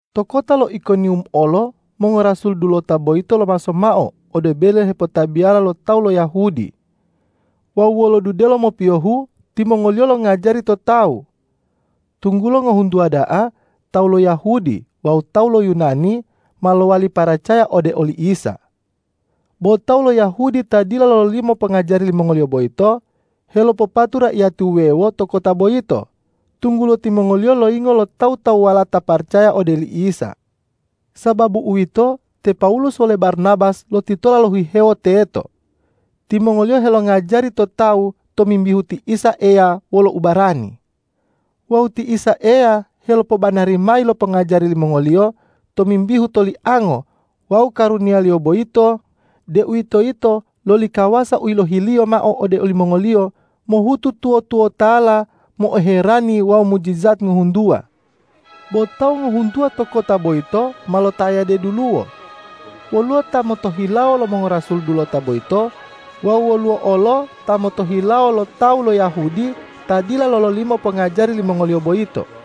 To kota lo Ikoniwum olo mongorasul dulota boyito lomaso mao ode bele hepotabiya lo tawu lo Yahudi wawu wolo dudelo mopiyohu timongoliyo longajari to tawu, tunggulo ngohuntuwa da'a tawu lo Yahudi wawu tawu lo Yunani ma lowali paracaya ode oli Isa. Bo tawu lo Yahudi ta dila lololimo pongajari limongoliyo boyito, helopopatu raiyati wuwewo to kota boyito, tunggulo timongoliyo loyingo lo tawu-tawuwala ta paracaya ode oli Isa. Sababu uwito, te Pawulus wole Barnabas lotitola lohihewo teto. Timongoliyo helongajari to tawu tomimbihu ti Isa Eya wolo ubarani. Wawu ti Isa Eya helopobanari mayi lo pongajari limongoliyo tomimbihu toliango wawu karuniya-Liyo boyito, deuwitoyito loli kawasa u yilohi-Liyo mao ode olimongoliyo mohutu tuwo-tuwotala mo'oherani wawu mujijat ngohuntuwa. Bo tawu ngohuntuwa to kota boyito ma lotayade duluwo, woluwo ta motohilawo lo mongorasul dulota boyito wawu woluwo olo ta motohilawo lo tawu lo Yahudi ta dila lololimo pongajari limongoliyo boyito.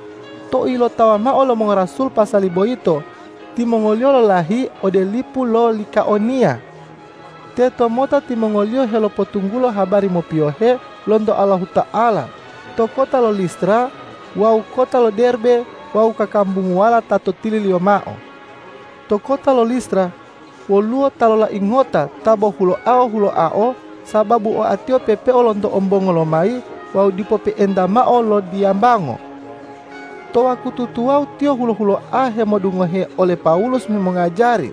Tou ilotawa mao lo mongorasul pasali boyito, timongoliyo lolahi ode lipu lo Likaoniya. Tetomota timongoliyo helopotunggulo habari mopiyohe lonto Allahuta'ala to kota lo Listra wawu kota lo Derbe wawu kakambunguwala to tililiyo mao. To kota lo Listra woluwo ta lolai ngota ta bo huloao-huloao, sababu oatiyo pepeo lonto ombongo lomayi wawu dipo pe'enta mao lodiyambango. To wakutu tuwawu tiyo hulo-huloa hemodungohe ole Pawulus hemongajari.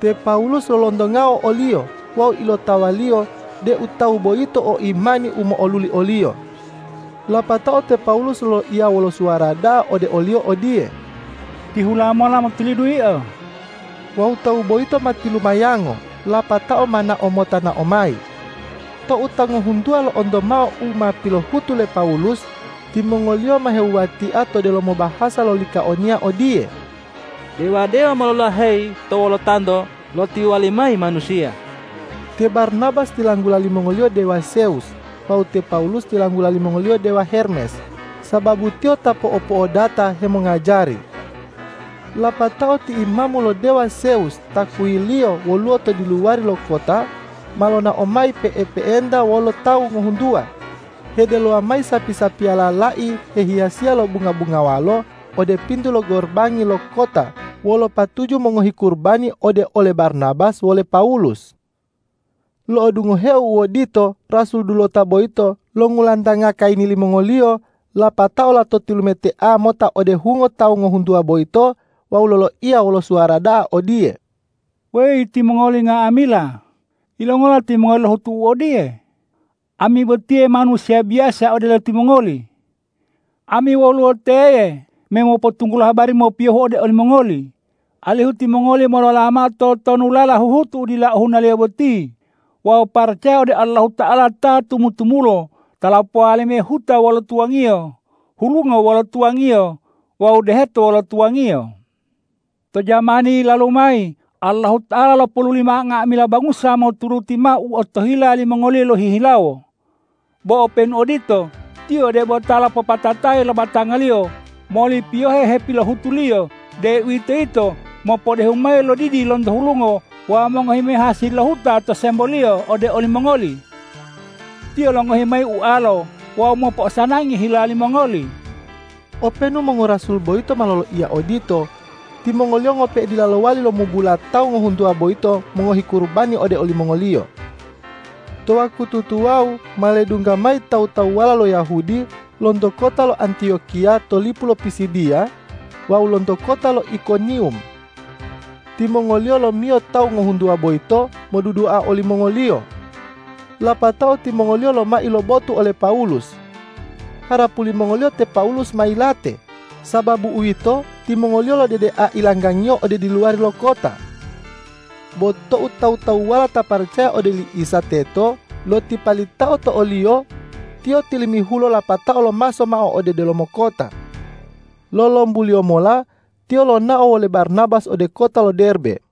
Te Pawulus lolontongao oliyo wawu ilotawaliyo deu tawu boyito o imani u mo'oluli oliyo. Lapatao te Pawulus loloiya wolo suwara da'a ode oliyo odiye,”Tihula mola motulidu yio!” Wawu tawu boyito ma tilumayango lapatao ma nao mota nao mayi. Tou ta ngohuntuwa lo'onto mao u ma pilohutu le Pawulus, timongoliyo ma hewuwatia to delomo bahasa lo Likaoniya odiye,”Dewa-dewa ma lolaheyi to wolotanto lotiwali mayi manusiya.” Te Barnabas tilanggula limongoliyo dewa Zewus wawu te Pawulus tilanggula limongoliyo dewa Hermes, sababu tiyo ta po'opo'odata hemongajari. Lapatao ti imamu lo dewa Zewus ta kuyilliyo woluwo to diluwari lo kota, ma lonao mayi pe'epe'enta wolo tawu ngohuntuwa, hedelowa mayi sapi-sapiyala lai hehiyasiya lo bunga-bungawalo ode pintu lo gorobangi lo kota wolo patuju mongohi kurubani ode ole Barnabas wole Pawulus. Lo'odungoheo u odito, rasul dulota boyito longulantanga kayini limongoliyo, lapatao lato tilumetea mota ode hungo tawu ngohuntuwa boyito wawu loloiya wolo suwara da'a odiye, ”Weyi timongoli nga'amila, yilongola timongoli lohutu u odiye? Ami botiye manusiya biyasa odelo timongoli. Ami woluwo teye me mopotunggulo habari mopiyohu ode olimongoli, alihu timongoli molola mao totonulala huhutu dila ohunaliyo boti wawu paracaya ode Allahuta'ala ta tumu-tumulo ta lopowali mayi lo huta wolo tuwangiyo, hulungo wolo tuwangiyo wawu deheto wolo tuwangiyo. To jamani yilalu mayi Allahuta'ala lopoluli mao nga'amila bangusa moturuti mao u otohila limongoliyo lohihilawo. Bo openu odito, Tiyo debo ta lopopatatayi lo batanga-Liyo moli piyohe hepilohutu-Liyo, deuwitoyito mopodehu mayi lo didi lonto hulungo wawu mongohi mayi hasili lo huta to semboliyo ode olimongoli. Tiyo longohi mayi ualo wawu mopo'osanangi hila limongoli.” Openu mongorasul boyito ma loloiya odito, timongoliyo ngope'e dila lowali lomubula tawu ngohuntuwa boyito mongohi kurubani ode olimongoliyo. To wakutu tuwawu ma ledungga mayi tawu-tawuwala lo Yahudi lonto kota lo Antiyokiya to lipu lo Pisidiya wawu lonto kota lo Ikoniwum. Timongoliyo lomiyo tawu ngohuntuwa boyito modudua olimongoliyo. Lapatao timongoliyo lomai lo botu ole Pawulus. Harapu limongoliyo te Pawulus ma yilate. Sababu uwito, timongoliyo lodedea ilanggangiyo ode diluwari lo kota. Bo tou tawu-tawuwala ta paracaya ode oli Isa teto lotipalitao to oliyo, tiyo tilimihulo lapatao lomaso mao ode delomo kota. Lolombuliyo mola tiyo lonao wole Barnabas ode kota lo Derbe.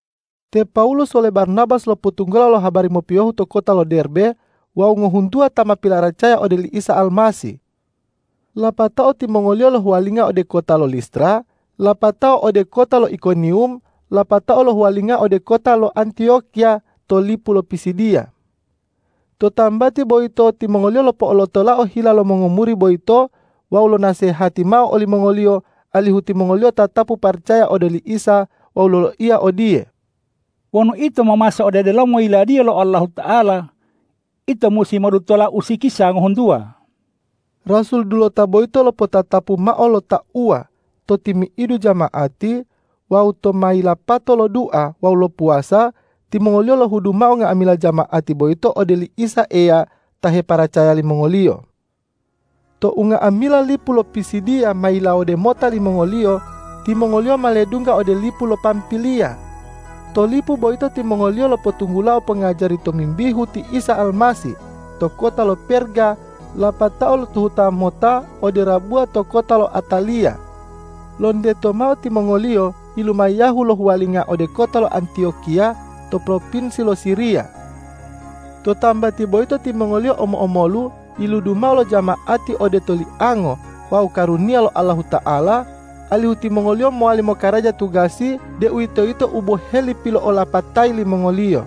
Te Pawulus wole Barnabas lopotunggulao lo habari mopiyohu to kota lo Derbe wawu ngohuntuwa ta ma pilaracaya ode oli Isa Almasih. Lapatao timongoliyo lohuwalinga ode kota lo Listra, lapatao ode kota lo Ikoniwum lapatao lohuwalinga ode kota lo Antiyokiya to lipu lo Pisidiya. To tambati boyito timongoliyo lopo'olotolao hila lo mongomuri boyito wawu lonasehati mao olimongoliyo alihu timongoliyo tatapu paracaya ode oli Isa wawu loloiya odiye,”Wonu ito momaso ode delomo Yiladiya lo Allahuta'ala, ito musi modutola usikisa ngohuntuwa.” Rasul dulota boyito lopotatapu mao lo tauwa to timi'idu jama'ati wawu tou ma yilapato lodua wawu lopuwasa, timongoliyo lohudu mao nga'amila jama'ati boyito ode oli Isa Eya ta heparacaya limongoliyo. Tou nga'amila lipu lo Pisidiya ma yilawode mota limongoliyo, timongoliyo ma ledungga ode lipu lo Pampiliya. To lipu boyito timongoliyo lopotunggulao pongajari tomimbihu ti Isa Almasih to kota lo Perga lapatao lotuhuta mota ode rabuwa to kota lo Ataliya. Lonteto mao timongoliyo yilumayahu lohuwalinga ode kota lo Antiyokiya to propinsi lo Siriya. To tambati boyito timongoliyo omo-omolu yiludu mao lo jama'ati ode toliango wawu karuniya lo Allahuta'ala, alihu timongoliyo mowali mokaraja tugasi, deuwitoyito u boheli pilo'olapatayi limongoliyo.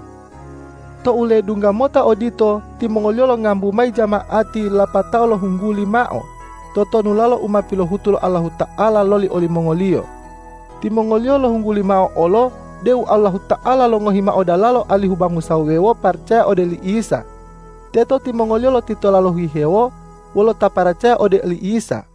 Tou ledungga mota odito, timongoliyo longambu mayi jama'ati lapatao lohungguli mao totonulalo u ma pilohutu lo Allahuta'ala loli olimongoliyo. Timongoliyo lohungguli mao olo deu Allahuta'ala longohi mao dalalo alihu bangusa wuwewo paracaya ode oli Isa. Teto timongoliyo lotitola lohihewo wolo ta paracaya ode oli Isa.